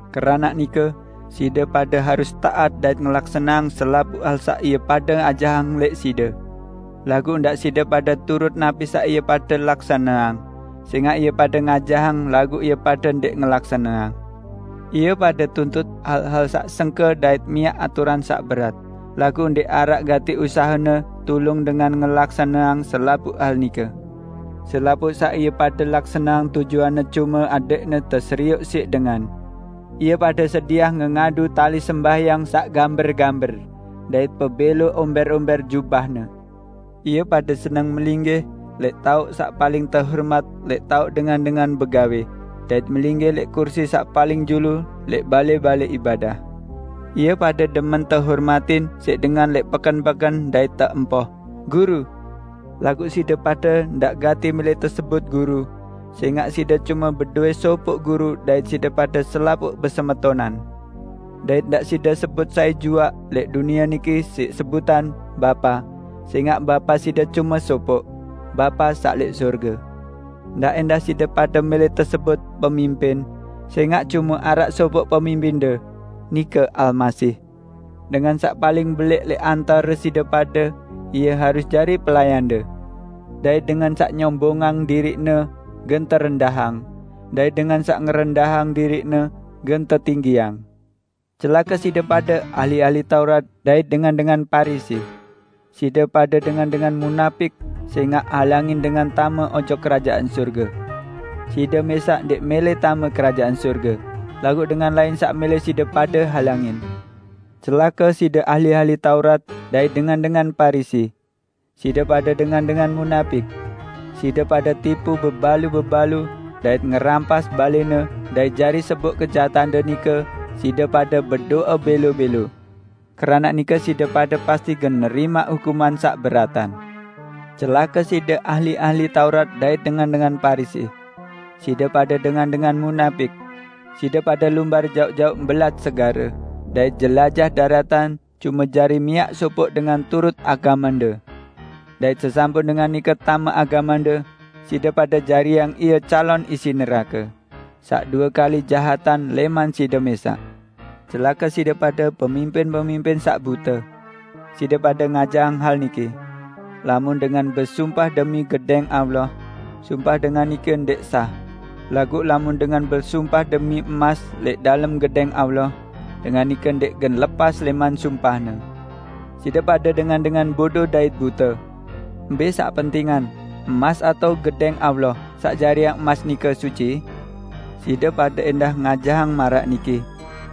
Keranaq nike side pade harus taat dait ngelaksaneang selapuq hal saq ie pade ajahang lẽq side. Laguq ndaq side pade turut napi saq ie pade laksaneang, sẽngaq ie pade ngajahang laguq ie pade ndẽq ngelaksaneang. Ie pade tuntut hal-hal saq sengke dait miaq aturan saq berat, laguq ndẽq araq gati usahene tulung dengan ngelaksaneang selapuq hal nike. Selapuq saq ie pade laksaneang tujuanne cume adẽqne teserioq siq dengan. Ie pade sediah ngengadu tali sembahyang saq gamber-gamber dait pebẽlo ombẽr-ombẽr jubahne! Ie pade seneng melinggih lẽq taoq saq paling tehormat lẽq taoq dengan-dengan begawẽ, dait melinggih lẽq kursi saq paling julu lẽq balẽ-balẽ ibadah. Ie pade demen tehormatin siq dengan lẽq peken-peken dait teempoh 'Guru'. Laguq side pade, ndaq gati mẽlẽ tesebut 'Guru', sẽngaq side cume bedowẽ sopoq Guru dait side pade selapuq besemetonan. Dait ndaq side sebut sai juaq lẽq dunie niki siq sebutan, 'Bapa', sẽngaq Bapa side cume sopoq, Bapa saq lẽq sorge. Ndaq ẽndah side pade mẽlẽ tesebut 'Pemimpin', sẽngaq cume araq sopoq Pemimpinde, nike Almasih. Dengan saq paling belẽq lẽq antare side pade, ie harus jari pelayande. Dait dengan saq nyombongang diriqne gen terendahang, dait dengan saq ngerendahang diriqne gen tetinggiang." "Celake side pade ahli-ahli Taurat dait dengan-dengan Parisi! Side pade dengan-dengan munapik sẽngaq halangin dengan tame ojok Kerajaan Sorge. Side mẽsaq ndẽq mẽlẽ tame Kerajaan Sorge, laguq dengan lain saq mẽlẽ side pade halangin. [ Celake side ahli-ahli Taurat dait dengan-dengan Parisi: Side pade dengan-dengan munapik. Side pade tipu bebalu-bebalu dait ngerampas balẽne dait jari seboq kejahatande nike side pade bedo'e bẽlo-bẽlo. Keranaq nike side pade pasti gen nerimaq hukuman saq beratan!] Celake side ahli-ahli Taurat dait dengan-dengan Parisi! Side pade dengan-dengan munapik! Side pade lumbar jaoq-jaoq mbelat segare, dait jelajah daratan cume jari miaq sopoq dengan turut agamende. Dait sesampun dengan nike tame agamende, side pade jariang ie calon isi nerake, saq due kali jahatan lẽman side mẽsaq! Celake side pade pemimpin-pemimpin saq bute! Side pade ngajahang hal niki, 'Lamun dengan besumpah demi Gedẽng Allah, sumpah dengan nike ndẽq sah; laguq lamun dengan besumpah demi emas lẽq dalem Gedẽng Allah, dengan nike ndẽq gen lepas lẽman sumpahne.' Side pade dengan-dengan bodo dait bute! Mbẽ saq pentingan; emas atao Gedẽng Allah saq jariang emas nike suci? Side pade ẽndah ngajahang maraq niki,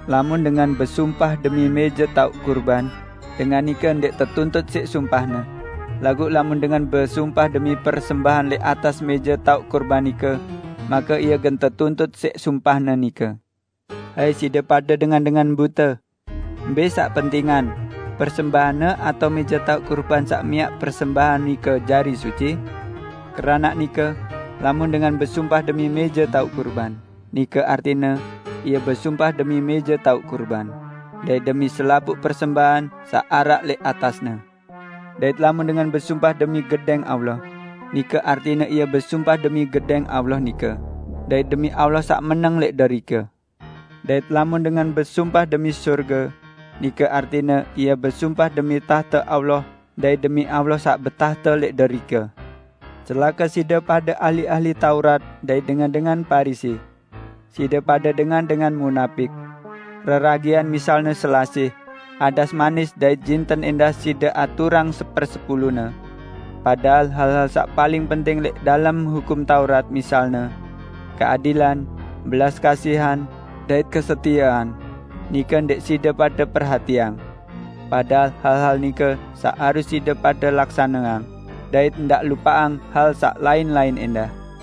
'Lamun dengan besumpah demi mẽje taoq kurban, dengan nike ndẽq tetuntut siq sumpahne; laguq lamun dengan besumpah demi persembahan lẽq atas mẽje taoq kurban nike, make ie gen tetuntut siq sumpahne nike.' Hai side pade dengan-dengan bute! Mbẽ saq pentingan? Persembahanne atao mẽje taoq kurban saq miaq persembahan nike jari suci? Keranaq nike, lamun dengan besumpah demi mẽje taoq kurban, nike artine ie besumpah demi mẽje taoq kurban, dait demi selapuq persembahan saq araq lẽq atasne. Dait lamun dengan besumpah demi Gedẽng Allah, nike artine ie besumpah demi Gedẽng Allah nike, dait demi Allah saq meneng lẽq derike. Dait lamun dengan besumpah demi sorge, nike artine ie besumpah demi tahte Allah dait demi Allah saq betahte lẽq derike. Celake side pade ahli-ahli Taurat dait dengan-dengan Parisi! Side pade dengan-dengan munapik. Reragian misalne selasih, adas manis dait jinten ẽndah side aturang sepersepulune. Padahal hal-hal saq paling penting lẽq dalem Hukum Taurat, misalne: Keadilan, belas kasihan, dait kesetiean, nike ndẽq side pade perhatiang. Padahal hal-hal nike saq harus side pade laksaneang, dait ndaq lupaqang hal saq lain-lain ẽndah.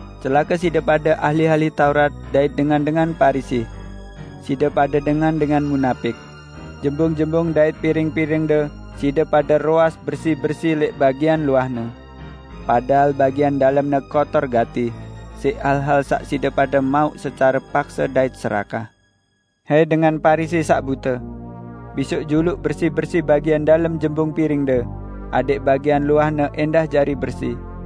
Celake side pade ahli-ahli Taurat dait dengan-dengan Parisi! Side pade dengan-dengan munapik! Jembung-jembung dait piring-piringde side pade roas bersi-bersi lẽq bagian luahne, padahal bagian dalemne kotor gati siq hal-hal saq side pade mauq secare pakse dait serakah. Hai dengan Parisi saq bute! Bisoq juluq bersi-bersi bagian dalem jembung piringde, adẽq bagian luahne ẽndah jari bersi!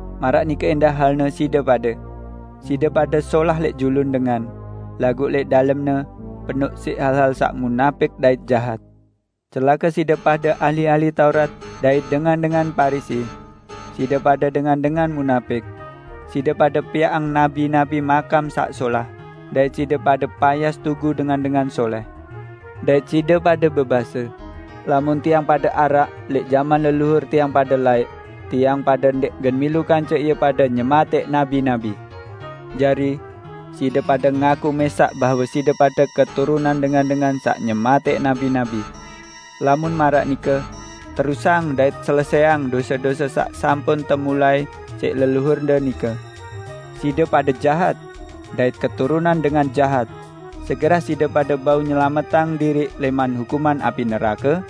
Maraq nike ẽndah halne side pade. Side pade solah lẽq julun dengan; laguq lẽq dalemne, penoq siq hal-hal saq munapik dait jahat." "Celake side pade ahli-ahli Taurat dait dengan-dengan Parisi! Side pade dengan-dengan munapik! Side pade piaqang nabi-nabi makam saq solah, dait side pade payas tugu dengan-dengan solẽh. Dait side pade bebase, 'Lamun tiang pade araq lẽq jaman leluhur tiang pade laẽq, tiang pade ndẽq gen milu kance ie pade nyematẽq nabi-nabi.' Jari, side pade ngaku mẽsaq bahwe side pade keturunan dengan-dengan saq nyematẽq nabi-nabi! Lamun maraq nike, terusang dait selesẽang dose-dose saq sampun temulai siq leluhurde nike! Side pade jahat! Dait keturunan dengan jahat! Segerah side pade bau nyelametang diriq lẽman hukuman api nerake?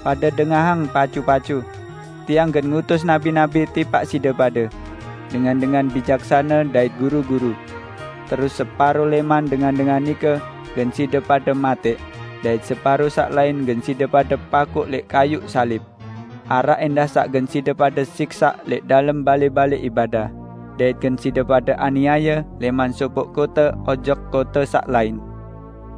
Pade dengahang pacu-pacu: Tiang gen ngutus nabi-nabi tipaq side pade, dengan-dengan bijaksane dait guru-guru; terus separo lẽman dengan-dengan nike gen side pade matẽq, dait separo saq lain gen side pade pakuq lẽq kayuq salib. Araq ẽndah saq gen side pade siksaq lẽq dalem balẽ-balẽ ibadah, dait gen side pade aniaye lẽman sopoq kote ojok kote saq lain.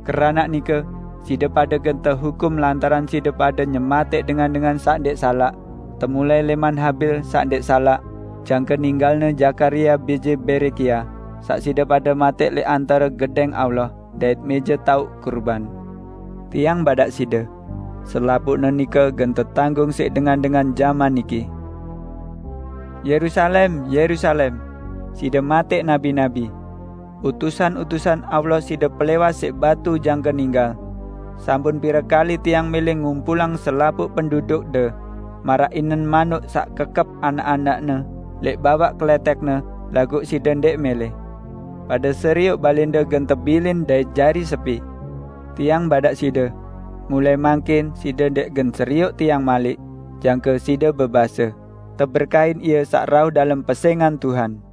Keranaq nike side pade gen tehukum lantaran side pade nyematẽq dengan-dengan saq ndẽq salaq -- temulai lẽman Habil saq ndẽq salaq, jangke ninggalne Zakaria bije Berekia, saq side pade matẽq lẽq antare Gedẽng Allah dait mẽje taoq kurban. Tiang badaq side: Selapuqne nike gen tetanggung siq dengan-dengan jaman niki!" "Yerusalem, Yerusalem! Side matẽq nabi-nabi. Utusan-utusan Allah side pelẽwas siq batu jangke ninggal. Sampun pire kali Tiang mẽlẽ ngumpulang selapuq pendudukde, maraq inen manuk saq kekep anak-anakne lẽq bawaq kelẽtẽkne, laguq side ndẽq mẽlẽ! Pade serioq balẽnde gen tebilin dait jari sepi. Tiang badaq side: Mulai mangkin side ndẽq gen serioq Tiang malik, jangke side bebase, 'Teberkahin Ie saq rauh dalem pesẽngan Tuhan.' "